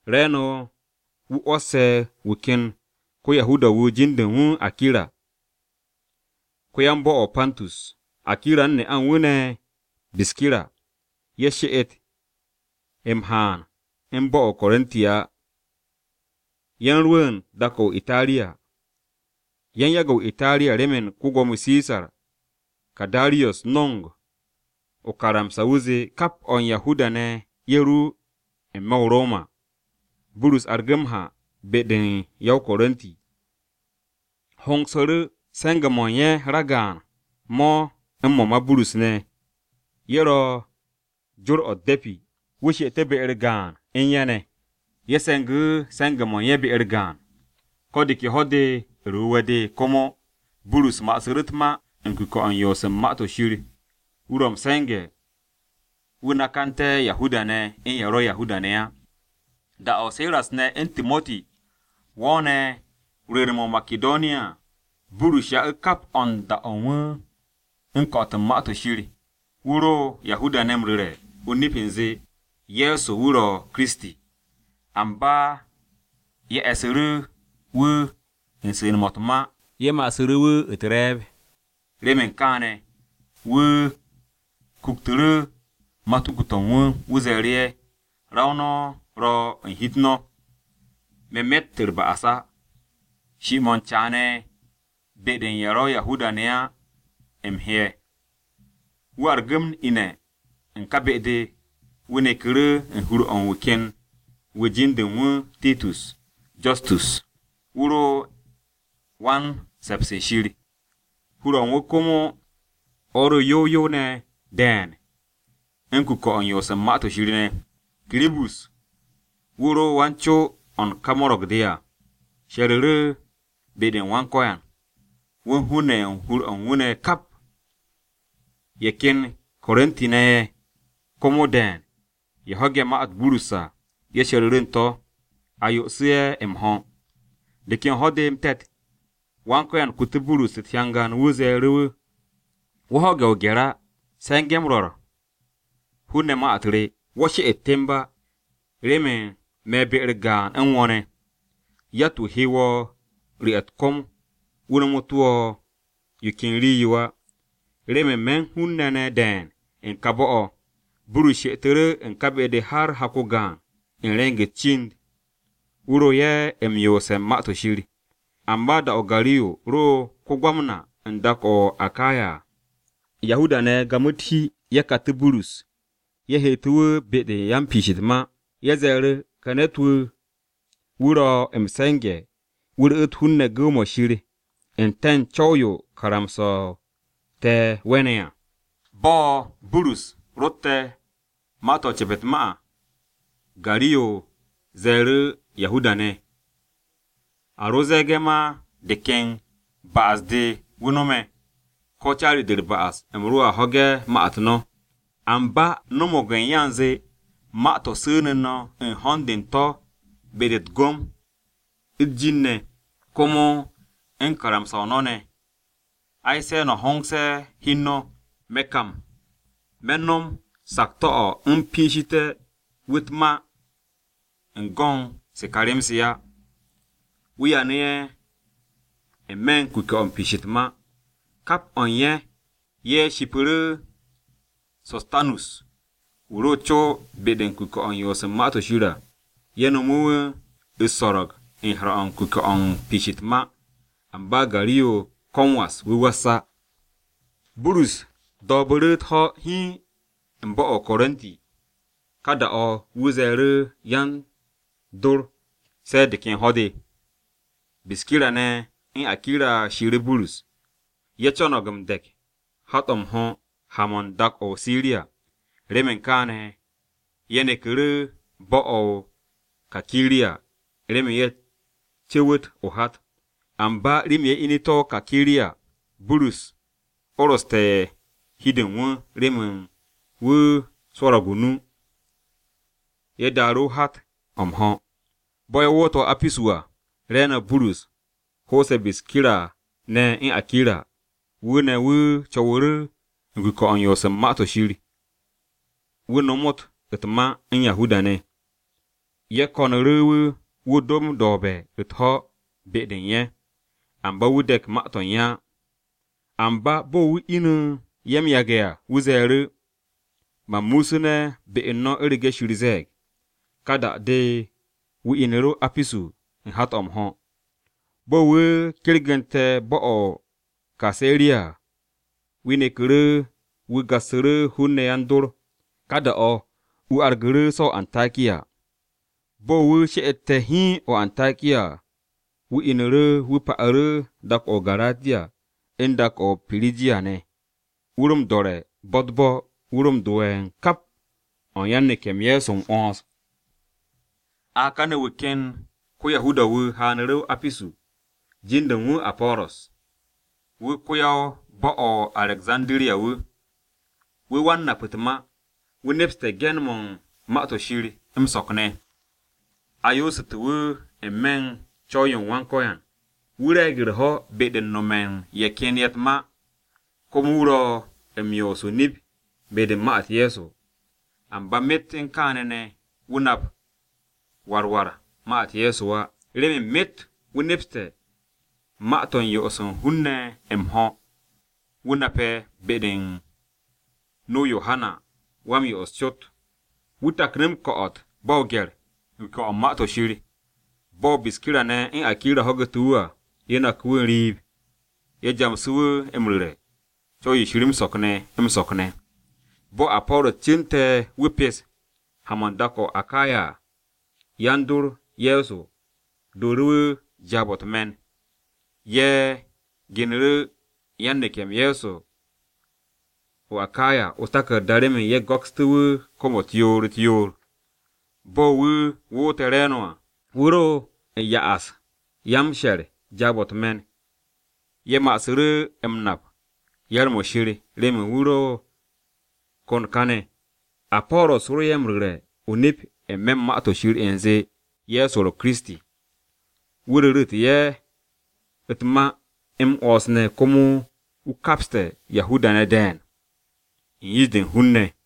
Re̱e̱no̱ wu̱ 'wo̱sse̱ wu̱ ken ko-Yahuda-wu̱ jin-de u̱n wu̱ Akira, ko-yan-bo̱-o̱ o-Pantus. Akira u̱n ne'a u̱n wu̱ ne̱ Biskira, ye̱ she'et m-haan ne̱ u̱n bo̱-o̱ o-Korinti á, ye̱ u̱n rwu̱u̱n dak-o̱ o-Itariya. Ye̱ u̱n yage̱ o-Itariya remen ko-Gwo̱mo Sisar Karadiyos no̱ng o-karamsa, wu̱ zee kap o̱ u̱n Yahuda-ne̱ ye̱ ru n-me̱ bo̱-o̱ o-Roma. Burus argu̱ m-ha be-de u̱n ye̱ o-Korinti. Hongsu̱ru̱ se̱nge̱-mo̱ u̱n ye̱ ragaan mo̱ u̱n mo̱ ma Burus ne̱, ye̱ ro̱ u̱n jor-o̱ u̱t-de̱pi, wu̱ she'etu̱ be-u̱r gaan u̱n ye̱ ne̱. Ye̱ se̱ngu̱ru̱ se̱nge̱-mo̱ u̱n ye̱ be-u̱r gaan. Ko̱ de ke Ho̱-de u̱r-Wu̱we̱ de komo, Burus ma'asu̱ru̱ u̱t-ma u̱n kuke̱-o̱ u̱n yoos u̱n Ma-to̱ Shir wu̱ ro m-se̱nge̱ wu̱ nakanté̱ Yahuda-ne̱ u̱n ye̱ ro̱ Yahuda-ne̱ á. Da-o̱ Siras ne̱ u̱n Timoti wo̱o̱ne̱ rwu̱u̱n-mo̱ o-Makidoniya à, Burus ya'u̱ kap o̱ u̱n da-o̱ u̱n wu̱ u̱n ko̱'o̱t u̱n Ma-to̱ Shir. Wu̱ ro Yahuda-ne̱ m-ru̱re̱ o-nip u̱nze, Ye̱so wu̱ ro̱ Kiristi. Amba ye̱ e̱su̱ru̱ wu̱ u̱n su̱ne̱-mo̱ u̱t-ma ye̱ ma'asu̱ wu̱ u̱t-re̱e̱b. Remen kaane̱, wu̱ kuktu̱ru̱ matuku-to̱ u̱n wu̱, wu̱ ze̱e̱ru̱ ye̱, “Ra-o no̱ ro̱ u̱n hi-u̱t no̱! Me̱ me̱tt u̱r-ba'as á. Shi-mo̱ u̱n caane̱ be-de u̱n ye̱ ro̱ Yahuda-ne̱ á u̱m he'e̱.” Wu̱ argu̱ m-ine̱ u̱n ka be-de, wu̱ neku̱ru̱ u̱n hur-o̱ u̱n wu̱ ken ne̱t-wu̱ jin-de u̱n wu̱ Titus Justus, wu̱ ro “Wan-se̱ps u̱n Shir.” Hur-o̱ u̱n wu̱ komo o̱ ro m-yow yow ne̱ de̱e̱n u̱n kuke̱-o̱ u̱n yoos u̱n Ma-to̱ Shir ne̱. Kiribus, wu̱ ro wan-co-o̱ u̱n ka mo̱ro̱g-de à, she̱ru̱ru̱ be-u̱r Wan-Ko̱yan, wu̱ u̱n hun-ne̱ ye̱ u̱n hur-o̱ u̱n wu̱ ne̱ kap. Ye̱ ken Korinti-ne̱ ye̱ komo de̱e̱n ye̱ ho̱ge̱ ma-u̱t Burus à, ye̱ she̱ru̱ru̱ u̱n to̱, a yo'osu̱ ye̱ m-ho̱. De ken ho̱-de m-te̱t, Wan-Ko̱yan kutu̱ Burus u̱t-hyangan. Wu̱ ze̱e̱ru̱ wu̱, “Wo̱ ho̱ge̱ o-gye̱r á, se̱nge̱ m-ru̱re̱ u̱n hun-ne̱ ma-u̱t re. Wo̱ she'et temb á, remen me̱ be-u̱r gaan u̱n wo̱ ne̱. Yatt-wu̱ he wo̱ m-ru̱'e̱ u̱t-kom wu̱ nomotu̱ wo̱ yo ken rii-yo á, remen me̱ u̱n hun-ne̱ ne̱ de̱e̱n u̱n ka bo̱-o̱.” Burus she'etu̱ru̱ u̱n ka be-de har hak-o gaan u̱n re̱ng-u̱s cind. Wu̱ ro ye̱ m-yoose̱ u̱n Ma-to̱ Shir. Amba da-o̱ Gariyo ro̱ ko-Gwamna u̱n dak-o̱ o-Akaya à, Yahuda-ne̱ gamu̱ u̱t-hi ye̱ katu̱ Burus, ye̱ heetu̱ wu̱ be-de yan-piish u̱t-ma. Ye̱ ze̱e̱ru̱, “Wu̱ ka ne̱t-wu̱ wu̱ ro̱ m-se̱nge̱ wu̱ ru̱'u̱t hun-ne̱ gu̱w-mo̱ Shir u̱nte̱ u̱n co̱w-yo karamsa-o te̱ we̱ne̱ à.” Bo̱ Burus rotte̱ u̱n ma-to̱ u̱n ce̱pt u̱t-ma à, Gariyo ze̱e̱ru̱ Yahuda-ne̱, “A ro ze̱e̱ge̱ ma de ken ba'as-de wu̱ no̱me̱, ko̱ caari-de u̱r-ba'as, u̱m roa ho̱ge̱ ma-u̱t no̱. Amba no̱mo̱g u̱n ya u̱nze ma-to̱ su̱nu̱ no̱ u̱n ho̱n-de u̱n to̱ be-de u̱t-gom, u̱t-jin ne̱, komo u̱n karamsa-o no̱ ne̱, ai se̱ no̱ hongse̱ hi u̱n no̱. Me̱ kam, me̱ no̱m sakto̱-o̱ u̱m piishité̱ wu̱ u̱t-ma u̱n go̱n se ka rem-se á.” Wu̱ yanu̱ ye̱ n-me̱ u̱n kuke̱-o̱ m-piish u̱t-ma. Kap o̱ u̱n ye̱, ye̱ shipu̱ru̱ So̱stanus wu̱ ro co be-de u̱n kuke̱-o̱ u̱n yoos u̱n Ma-to̱ Shir à. Ye̱ nomu̱ wu̱ u̱s-so̱ro̱g u̱n he̱r-o̱ u̱n kuke̱-o m-piish u̱t-ma. Amba Gariyo ko̱ m-was wu̱ was á. Burus do̱o̱bu̱ru̱ u̱t-ho̱ hiin u̱n bo̱-o̱ o-Korinti. Ka da-o̱, wu̱ ze̱e̱ru̱ yan-dor se̱ de̱ ken ho̱-de. Biskira ne̱, u̱n Akira shiiru̱ Burus. Ye̱ co̱no̱g m-de̱k hat-o̱ m-ho̱ ha-mo̱ u̱n dak-o̱ o-Siriya. Remen kaane̱, ye̱ neku̱ru̱ bo̱-o̱ o-Kakiriya remen ye̱ co̱wu̱t o-hat. Amba rii-yo ye̱ inu̱te̱ o-Kakiriya, Burus oroste̱ hi-de u̱n wu̱ remen wu̱ swo̱ro̱g o-nu. Ye̱ daaru̱ hat-o̱ m-ho̱. Bo̱ ye̱ woote̱ o-Apisu à, re̱e̱no̱ Burus ho'ose̱ Biskira ne̱ u̱n Akira. Wu̱ ne̱, wu̱ co̱wu̱ru̱ u̱n kuke̱-o̱ u̱n yoos u̱n Ma-to̱ Shir, wu̱ nomot u̱t-ma u̱n Yahuda-ne̱. Ye̱ ko̱nu̱ru̱ wu̱, wu̱ do m-do̱o̱be̱ u̱t-ho̱ be-de u̱n ye̱, amba wu̱ de̱k ma-to̱ u̱n ye̱ á. Amba bo̱ wu̱ inu̱ ye̱ m-yage̱ à, wu̱ ze̱e̱ru̱, “Man muusune̱ be u̱n no̱ u̱rege̱ Shir ze̱e̱g.” Ka da-de, wu̱ inu̱ru̱ o-Apisu u̱n hat-o̱ m-ho̱. Bo̱ wu̱ kergu̱nte̱ bo̱-o̱ o-Kaseriya à, wu̱ neku̱ru̱ wu̱ gassu̱ru̱ hun-ne̱ yan-dor. Ka da-o̱ wu̱ argu̱ru̱ so̱ o-Antakiya. Bo̱ wu̱ she'ete̱ hiin o-Antakiya à, wu̱ inu̱ru̱ wu̱ pa'u̱ru̱ dak-o̱ o-Garatiya u̱n dak-o̱ o-Pirijiya ne̱. Wu̱ ro m-do̱re̱ bo̱-u̱t u̱t-bo̱, wu̱ ro m-do'e̱ u̱n kap o̱ u̱n yan-neke̱-m Ye̱so m-'wo̱ns. A kane̱ wu̱ ken ko-Yahuda-wu̱ haanu̱ru̱ o-Apisu, jin-de u̱n wu̱ Apo̱ro̱s. Wu̱ ko-yan-bo̱-o̱ o-Arekzandiriya. Wu̱ wan-nap u̱t-ma, wu̱ nepste̱ ge̱n-mo̱ u̱n Ma-to̱ Shir m-so̱k ne̱. A yoosu̱te̱ wu̱ n-me̱ u̱n co̱w-yo u̱n Wan-Ko̱yan. Wu̱ re̱e̱g u̱r-ho̱ be-de u̱n nome̱ u̱n ye̱ ken ye̱ u̱t-ma, komo wu̱ ro̱ m-yoos o-nip be-de u̱n ma-u̱t Ye̱so. Amba myet u̱n kaane̱ ne̱, wu̱ nap war war ma-u̱t Ye̱so á, remen myet wu̱ nepste̱ ma-to̱ yo'os u̱n hun-ne̱ m-ho̱, wu̱ nape̱ be-de u̱n nu-o Yohana Wa-m-Yo'os cot. Wu̱ taknu̱ m-ko̱'o̱t ba o-gye̱r, u̱n kuke̱-o̱ u̱n yoos u̱n Ma-to̱ Shir. Bo̱ Biskira ne̱ u̱n Akira ho̱gu̱te̱ wu̱ à, ye̱ naku̱ wu̱ n-riib. Ye̱ jamsu̱ wu̱ m-ru̱re̱ Co̱w-yo Shir m-so̱k ne̱, m-so̱k ne̱. Bo̱ Apo̱ro̱s cu̱nte̱ wu̱ pes ha-mo̱ u̱n dak-o̱ o-Akaya à, yan-dor Ye̱so dooru̱ wu̱ jaab-o̱ u̱t-me̱n. Ye̱ genu̱ru̱ yan-neke̱-m Ye̱so o-Akaya o-taku̱rda remen ye̱ go̱kstú̱ wu̱ kom-u̱t yoor-u̱t-yoor. Bo̱ wu̱ woote̱ re̱e̱no̱ à, wu̱ ro u̱n do ye̱ u̱n yan-m-she̱r jaab-o̱ u̱t-me̱n. Ye̱ ma'asu̱ru̱ m-nap yar-mo̱ Shir remen wu̱ ro kon káne̱. Apo̱ro̱s ro ye̱ m-ru̱re̱ o-nip n-me̱ u̱n Ma-to̱ Shir u̱nze Ye̱so ro̱ Kiristi. Wu̱ ru̱ru̱te̱ ye̱ u̱t-ma m-'wo̱ns ne̱ komo wu̱ kapste̱ Yahuda-ne̱ de̱e̱n u̱n yish-de u̱n hun-ne̱.